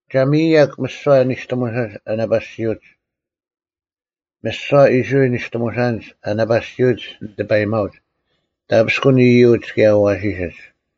“ᒐ ᒥᔨᔭᒄ ᒥᓯᐛ ᓂᔅᑎᒧᓴᓐᒡ ᐊ ᓇᐸᓯᐅᒡ᙮ ᒥᓯᐛ ᐃᔅᕋᐃᓪ ᓂᔅᑎᒧᓴᓐᒡ ᐊ ᓇᐸᓯᐅᒡ ᓂᑎᐸᔨᒪᐅᒡ, ᑕᐱᔅᑯᓐ ᐃᔪᒡ ᑭᔭ ᐊᐛᓯᓯᒡ᙮”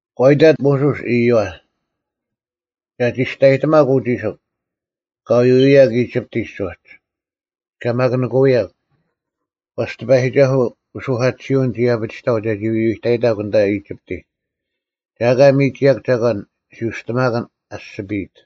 ᒂ ᐃᑕᑦ ᒧᓱᔅ ᐃᔪᐛ, “ᒐ ᒋᔅᑕᔨᑎᒪᒃ ᐅ ᒋᓯᒄ, ᑲ ᐎᐎᔭᒄ ᐃᒋᑉᑎᒡ ᐅᒡ, ᑲ ᒪᑯᓂᑯᐅᔭᒄ, ᐛᔅ ᑎᐸᔨᒋᒐᓱᐤ ᐅᓱᐧᑲᑎᓯᐅᓐ ᒋ ᐊᐱᒋᑕᐤ ᒐᒋ ᐎᐎᑕᔨᑕᒄ ᐊᓐᑕ ᐃᒋᑉᑎᒡ᙮ ᒐ ᐊᑲ ᒥᒋᔭᒄ ᒐᒂᓐ ᓯᐅᔅᑎᒪᑭᓐ ᐊᔅᒋᐱᔨᑦ᙮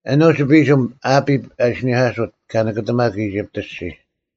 ᐊᓄᒡ ᐱᓯᒻ, ᐊᐱᑉ ᐊ ᐃᓯᓂᐧᑲᓱᑦ, ᑲ ᓂᑭᑎᒪᒄ ᐃᒋᑉᑦ ᐊᔅᒋᔾ᙮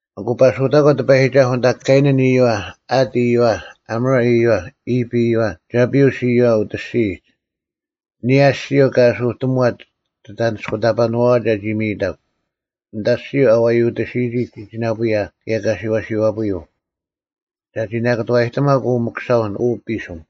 ᐊᑯ ᐸᓱᐅᑕᒂ ᑎᐸᔨᒋᒐᓱᐤ ᐊᓐᑕ ᑲᐃᓇᓐ ᐃᔪᐛ, ᐊᑦ ᐃᔪᐛ, ᐊᒧᕆ ᐃᔪᐛ, ᐃᑉ ᐃᔪᐛ, ᒐᐱᐅᔅ ᐃᔪᐛ ᐅᑦ ᐊᔅᒋᔨᒡ, ᐊᓂᔭ ᐊᔅᒋᔪᐤ ᑲ ᐊᓱᑎᒧᐛᑦ ᒋᑦ ᐊᓂᔅᑯᑕᐸᓇᐛᐛ ᒐᒋ ᒥᔨᑕᒄ, ᐊᓐᑕ ᐊᔅᒋᔪᐤ ᐊ ᐛᔪᑎᓯᔨᒋ ᒋᒋᓇᐳᔭ ᑭᔭ ᑲᓯᐛᓯᐛᐳᔪᐤ, ᒐᒋ ᓇᑭᑐᐛᔨᑎᒪᒃ ᐅ ᒥᑯᓴᐅᓐ ᐅ ᐱᓯᒻ᙮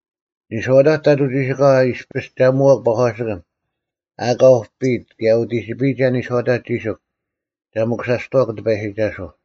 ᓂᔄᐅᑕᒡ ᑕᑐᐤ ᒋᓯᑲᐛ ᐃᔅᐱᔅ ᒐ ᒧᐛᒃ ᐸᒂᓯᑭᓐ ᐊᑲ ᐅᐱᔨᑦ ᑭᔭ ᐅᑎᒋᐱᔨᒐ ᓂᔄᐅᑕᒡ ᒋᓯᒄ ᒐ ᒥᑯᓴᔅᑐᐛᒄ ᑎᐸᔨᒋᒐᓱᐤ᙮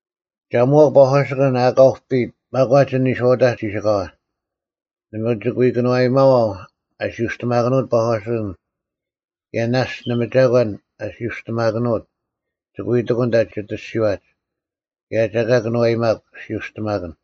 ᒐ ᒧᐛᒃ ᐸᒂᓯᑭᓐ ᐊᑲ ᐅᐱᔨᑦ ᒪᒂᒡ ᐊᓐ ᓂᔄᐅᑕᒡ ᒋᓯᑲᐛ; ᓇᒪ ᒋᑭ ᐎ ᑭᓄᐛᔨᒪᐛᐤ ᐊ ᓯᐅᔅᑎᒪᑭᓄᐅᑦ ᐸᒂᓯᑭᓐ ᑭᔭ ᓇᔅᒡ ᓇᒪ ᒐᒂᓐ ᐊᓯᐅᔅᑎᒪᑭᓄᐅᑦ ᒋᑭ ᐎ ᑎᑯᓐ ᐊᓐᑕ ᒋᑦ ᐊᔅᒋᐛᒡ, ᑭᔭ ᒐ ᐊᑲ ᑭᓄᐛᔨᒪᒃ ᓯᐅᔅᑎᒪᑭᓐ᙮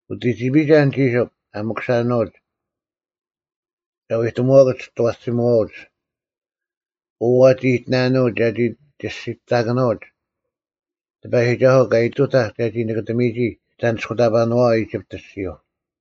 ᐅᑎᒋᐱᔨᒐ ᐊᓐ ᒋᓯᒄ ᐊ ᒥᑯᓴᓄᐅᒡ, ᒐ ᐎᑎᒧᐛᑯᒡ ᒋᑦ ᐊᐛᓯᒧᐛᐅᒡ, ‘ᐅ ᐛᒋ ᐃᑎᓇᓄᐅᒡ ᒐᒋ ᒋᓯᑕᑭᓄᐅᒡ ᑎᐸᔨᒋᒐᓱᐤ ᑲ ᐃᑐᑕᐧᒃ ᒐᒋ ᓂᑭᑕᒥᒋ ᒋᑦ ᐊᓂᔅᑯᑕᐸᓄᐛ ᐃᒋᑉᑦ ᐊᔅᒋᔪᐤ᙮’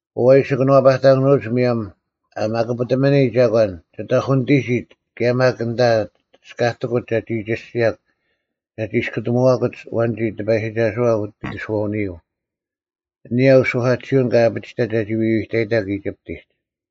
ᐅ ᐊ ᐃᓯ ᑭᓄᐛᐱᑕᑭᓄᐅᒡ ᒧᔭᒻ ᐊ ᒪᑯᐱᑎᒥᓂ ᒐᒂᓐ ᒋᑦ ᐅᐧᑯᓂᑎᒋᒡ ᑭᔭ ᒪᒃ ᐊᓐᑕ ᒋᔅᑲᑎᑯᒡ ᒐᒋ ᒋᔅᒋᔭᒄ ᒐᒋ ᒋᔅᑯᑎᒧᐛᑯᒡ ᐊᐛᓐᒋ ᑎᐸᔨᒋᒐᓱᐛ ᐅᑦ ᐃᑎᓱᐛᐅᓂᔪᐤ, ᐊᓂᔭ ᐅᓱᐧᑲᑎᓯᐅᓐ ᑲ ᐊᐱᒋᑕᑦ ᒐᒋ ᐎᐎᑕᔨᑕᒄ ᐃᒋᑉᑎᒡ᙮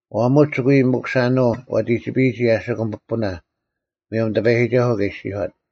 ᐛᒧᒡ ᒋᑭ ᐎ ᒥᑯᓴᓄᐤ ᐛᑎᒋᐱᔨᒋ ᐊᓯᑯᒻ ᐱᐳᓇ ᒧᔭᒻ ᑎᐸᔨᒋᒐᓱᐤ ᑲ ᐃᔅᒋᔄᑦ᙮”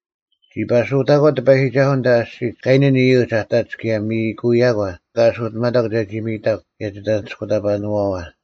“ᒋ ᐸᓱᐅᑕᒂ ᑎᐸᔨᒋᒐᓱᐤ ᐊᓐᑕ ᐊᔅᒋᒡ ᑲᐃᓇᓐ ᐃᔪᒡ ᐊ ᑕᒡ ᑭᔭ ᒥᔨᑯᔭᒂ, ᑲ ᐊᓱᑎᒪᑕᒄ ᒐᒋ ᒥᔨᑕᒄ ᑭᔭ ᒋᐊᓂᔅᑯᑕᐸᓄᐛᐛ,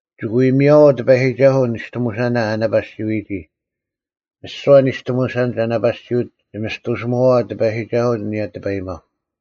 ᒋᑭ ᐎ ᒥᔭᐛᐤ ᑎᐸᔨᒋᒐᓱᐤ ᓂᔅᑎᒧᓴᓇ ᐊ ᓇᐸᓯᐎᔨᒋ᙮ ᒥᓯᐛ ᓂᔅᑎᒧᓴᓐᒡ ᐊ ᓇᐸᓯᐅᒡ ᒋᒥᔅᑐᓯᒧᐛᐛ ᑎᐸᔨᒋᒐᓱᐤ ᐊᓂᔭ ᑎᐸᔨᒪᐤ᙮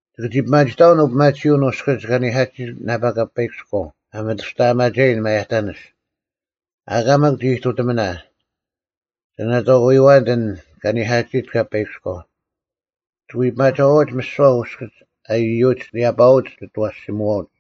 ᒋᑭ ᒋ ᐱᒪᒋᑕᐛᓐ ᐅᐱᒪᑎᓯᐅᓐ ᐅᔅᑭᒡ ᑲᓂᐧᑲᑎᓯᑦ ᓇᐸ ᑲᐸᐃᑭᔎᐤ ᐊ ᒥᑐᔅᑕᐊᒪᒐᔨᓐ ᒪᔭᑕᓂᔅ; ᐊᑲ ᒪᒃ ᒋ ᐃᑐᑎᒥᓇ, ᒐ ᓇᑥᑯᔪᐛᓐᑦ ᐊᓐ ᑲᓂᐧᑲᑎᓯᑦ ᑲᐸᐃᑭᔎᐤ᙮ ᒋᑭ ᐎ ᐱᒪᒐᐛᐅᒡ ᒥᓯᐛ ᐅᔅᑭᒡ ᐊ ᐃᔪᐅᒡ ᓂᔭᐸᐅᒡ ᒋᑦ ᐊᐛᓯᒧᐛᐅᒡ᙮”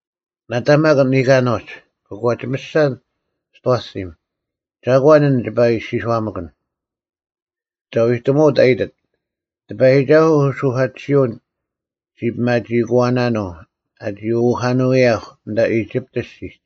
“ᓇᑕ ᒪ ᓂᑲᓄᒡ, ᑯᒂᒋᒥᔅᒐ ᒋᑦ ᐊᐛᓯᒻ, ‘ᒐᒂᓐ ᐊᓐ ᒋᐸ ᐃᔅᒋᔄᒥᑯᓐ?’ ᒐ ᐛᐎᑎᒧᐅᑦ ᐊ ᐃᑎᑦ, ‘ᑎᐸᔨᒋᒐᓱᐤ ᐅᓱᐧᑲᑎᓯᐅᓐ ᔅᒋ ᐱᒪᒋᐃᑯᐛᓇᓄᐤ ᐊᒋ ᐅᑦ ᐊᐱᒋᐊᑭᓄᐅᔭᐧᒄ ᐊᓐᑕ ᐃᒋᑉᑦ ᐊᔅᒋᒡ᙮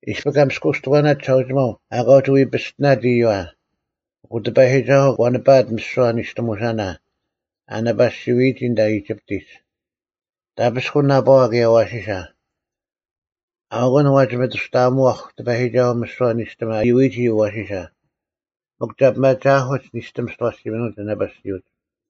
ᐃᔅᐱ ᑲ ᒥᔅᑯᔅᑎᒂᓇᑦ ᒋᓴᐅᒋᒪᐤ ᐊᑲ ᐅᒋ ᐎ ᐱᔅᑎᓇᑦ ᐃᔪᐛ, ᐊᑯ ᑎᐸᔨᒋᒐᓱᐤ ᒂ ᓂᐸᐊᑦ ᒥᓯᐛ ᓂᔅᑎᒧᓴᓇ ᐊ ᓇᐸᓯᐎᔨᒋ ᐊᓐᑕ ᐃᒋᑉᑎᒡ, ᑕᐱᔅᑯᓐ ᓇᐸᐛ ᑭᔭ ᐊᐛᓯᓴ᙮ ᐊᐅᑯᓐ ᐛᒋ ᒥᑐᔅᑕᐊᒧᐛᐧᒄ ᑎᐸᔨᒋᒐᓱᐤ ᒥᓯᐛ ᓂᔅᑎᒻ ᐊ ᐃᔪᐎᔨᒋ ᐊᐛᓯᓴ, ᒥᒄ ᒐ ᐱᒪᒋᐊᐧᑯᒡ ᓂᔅᑎᒻ ᒋᑦ ᐊᐛᓯᒥᓄᐅᒡ ᐊ ᓇᐸᓯᐅᒡ᙮’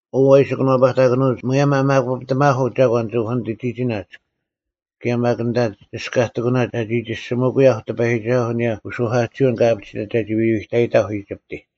ᐅ ᐊ ᐃᓯ ᑭᓄᐛᐱᑕᑭᓄᐅᒡ ᒧᔭᒻ ᐊ ᒪᑯᐱᑎᒪᐧᑯᐤ ᒐᒂᓐ ᒋᑦ ᐅᐧᑯᓂᑎᒋᓇᒡ ᑭᔭ ᒪᒃ ᐊᓐᑕ ᒋᔅᑲᑎᑯᓇᒡ ᒐᒋ ᒋᔅᒋᒥᑯᔭᐧᒄ ᑎᐸᔨᒋᒐᓱᐤ ᐊᓂᔭ ᐅᓱᐧᑲᑎᓯᐅᓐ ᑲ ᐊᐱᒋᑕᑦ ᒐᒋ ᐎᐎᑕᔨᑕᐧᒄ ᐃᒋᑉᑎᒡ᙮”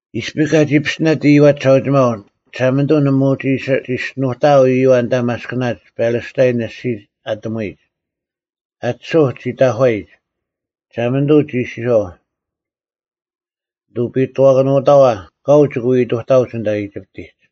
ᐃᔅᐱ ᑲᒋ ᐱᔅᑎᓇᑦ ᐃᔪᐛ ᒋᓴᐅᒋᒪᐤ, ᒋᓴᒪᓂᑐᐤ ᓇᒪ ᐅᒋ ᐃᓯ ᒋᔅᒋᓄᑕᐤ ᐃᔪᐛ ᐊᓐᑕ ᒪᔅᑭᓇᒡ ᐱᓕᔅᑕᐃᓐ ᐊᔅᒋᒡ ᐊᑎᒧᐎᒡ, ᐊᑎᓱᐧᒄ ᒋ ᑕᒂᔨᒡ᙮ ᒋᓴᒪᓂᑐᐤ ᒋ ᐃᔅᒋᔄᐤ, “ᓂᑐᐱᔨᑐᐛᑭᓄᑥᐛ, ᑲᐤ ᒋᑭ ᐎ ᐃᑐᑕᐅᒡ ᐊᓐᑕ ᐃᒋᑉᑎᒡ᙮”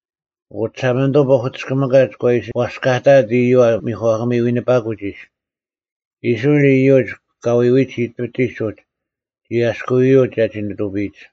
ᐊᑯ ᒋᓴᒪᓂᑐᐤ ᐸᐧᑯᑎᔅᑭᒥᑲᒡ ᒂ ᐃᓯ ᐛᔅᑲᑕᐊᑦ ᐃᔪᐛ ᒥᒂᑭᒥ ᐎᓂᐸᑯᒡ ᐃᔅ᙮ ᐃᔅᕋᐃᓪ ᐃᔪᒡ ᑲ ᐎᐎᒡ ᐃᒋᑉᑎᒡ ᐅᒡ ᒋ ᐊᔭᔅᑯᐎᔪᒡ ᒐᒋ ᓂᑐᐱᔨᒡ᙮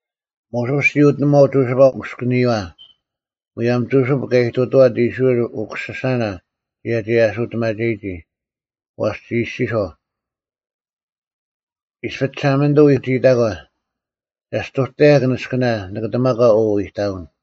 ᒧᓱᔅ ᒋ ᐅᑎᓂᒺᐤ ᒍᓯᐸ ᐅᔅᑭᓂᔨᐛ, ᒧᔭᒻ ᒍᓯᑉ ᑲ ᐃᑐᑐᐛᑦ ᐃᔅᕋᐃᓪ ᐅᑯᓯᓴᓇ ᒐᒋ ᐊᓱᑎᒪᒐᔨᒋ᙮ ᐛᔅ ᒋ ᐃᔅᒋᔄᐤ, “ᐃᔅᐱ ᒋᓴᒪᓂᑐᐤ ᐎᒋᐃᑕᒂ, ᒐᔅᑐᑕᔭᒄ ᓂᔅᑭᓇ ᓂᑭᑎᒪᒂ ᐅ ᐃᑕᐅᓐ᙮”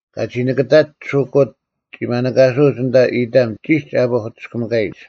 ᑲᒋ ᓂᑭᑕᒡ ᓱᑯᑦ ᒋ ᒪᓂᑲᓱᐅᒡ ᐊᓐᑕ ᐃᑕᒻ ᒋᒡ ᐊ ᐸᐧᑯᑎᔅᑭᒥᑲᔨᒡ᙮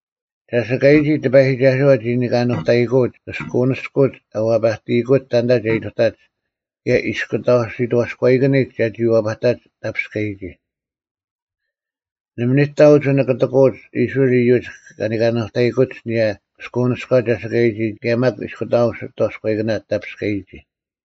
ᒐᓯᑲᔨᒋ ᑎᐸᔨᒋᒐᓱᐛ ᒋ ᓂᑲᓄᑕᔨᑯᐅᒡ ᑭᔅᑯᐅᓂᔅᑯᒡ ᐊ ᐛᐸᑎᔨᑯᒡ ᑕᓐᑕ ᒐ ᐃᑐᑕᒡ ᑭᔭ ᐃᔅᑯᑕᐤ ᓯᑥᔎᐃᑭᓂᒡ ᒐᒋ ᐛᐸᑕᒡ ᑕᐱᔅᑲᔨᒋ᙮ ᓇᒪ ᓂᑕ ᐅᒋ ᓂᑭᑎᑯᐅᒡ ᐃᔅᕋᐃᓪ ᐃᔪᒡ ᑲ ᓂᑲᓄᑕᔨᑯᒡ ᐊᓂᔭ ᑭᔅᑯᐅᓂᔎ ᒐᓯᑲᔨᒋ ᑭᔭ ᒪᒃ ᐃᔅᑯᑕᐤ ᓯᑥᔎᐃᑭᓇ ᑕᐱᔅᑲᔨᒋ᙮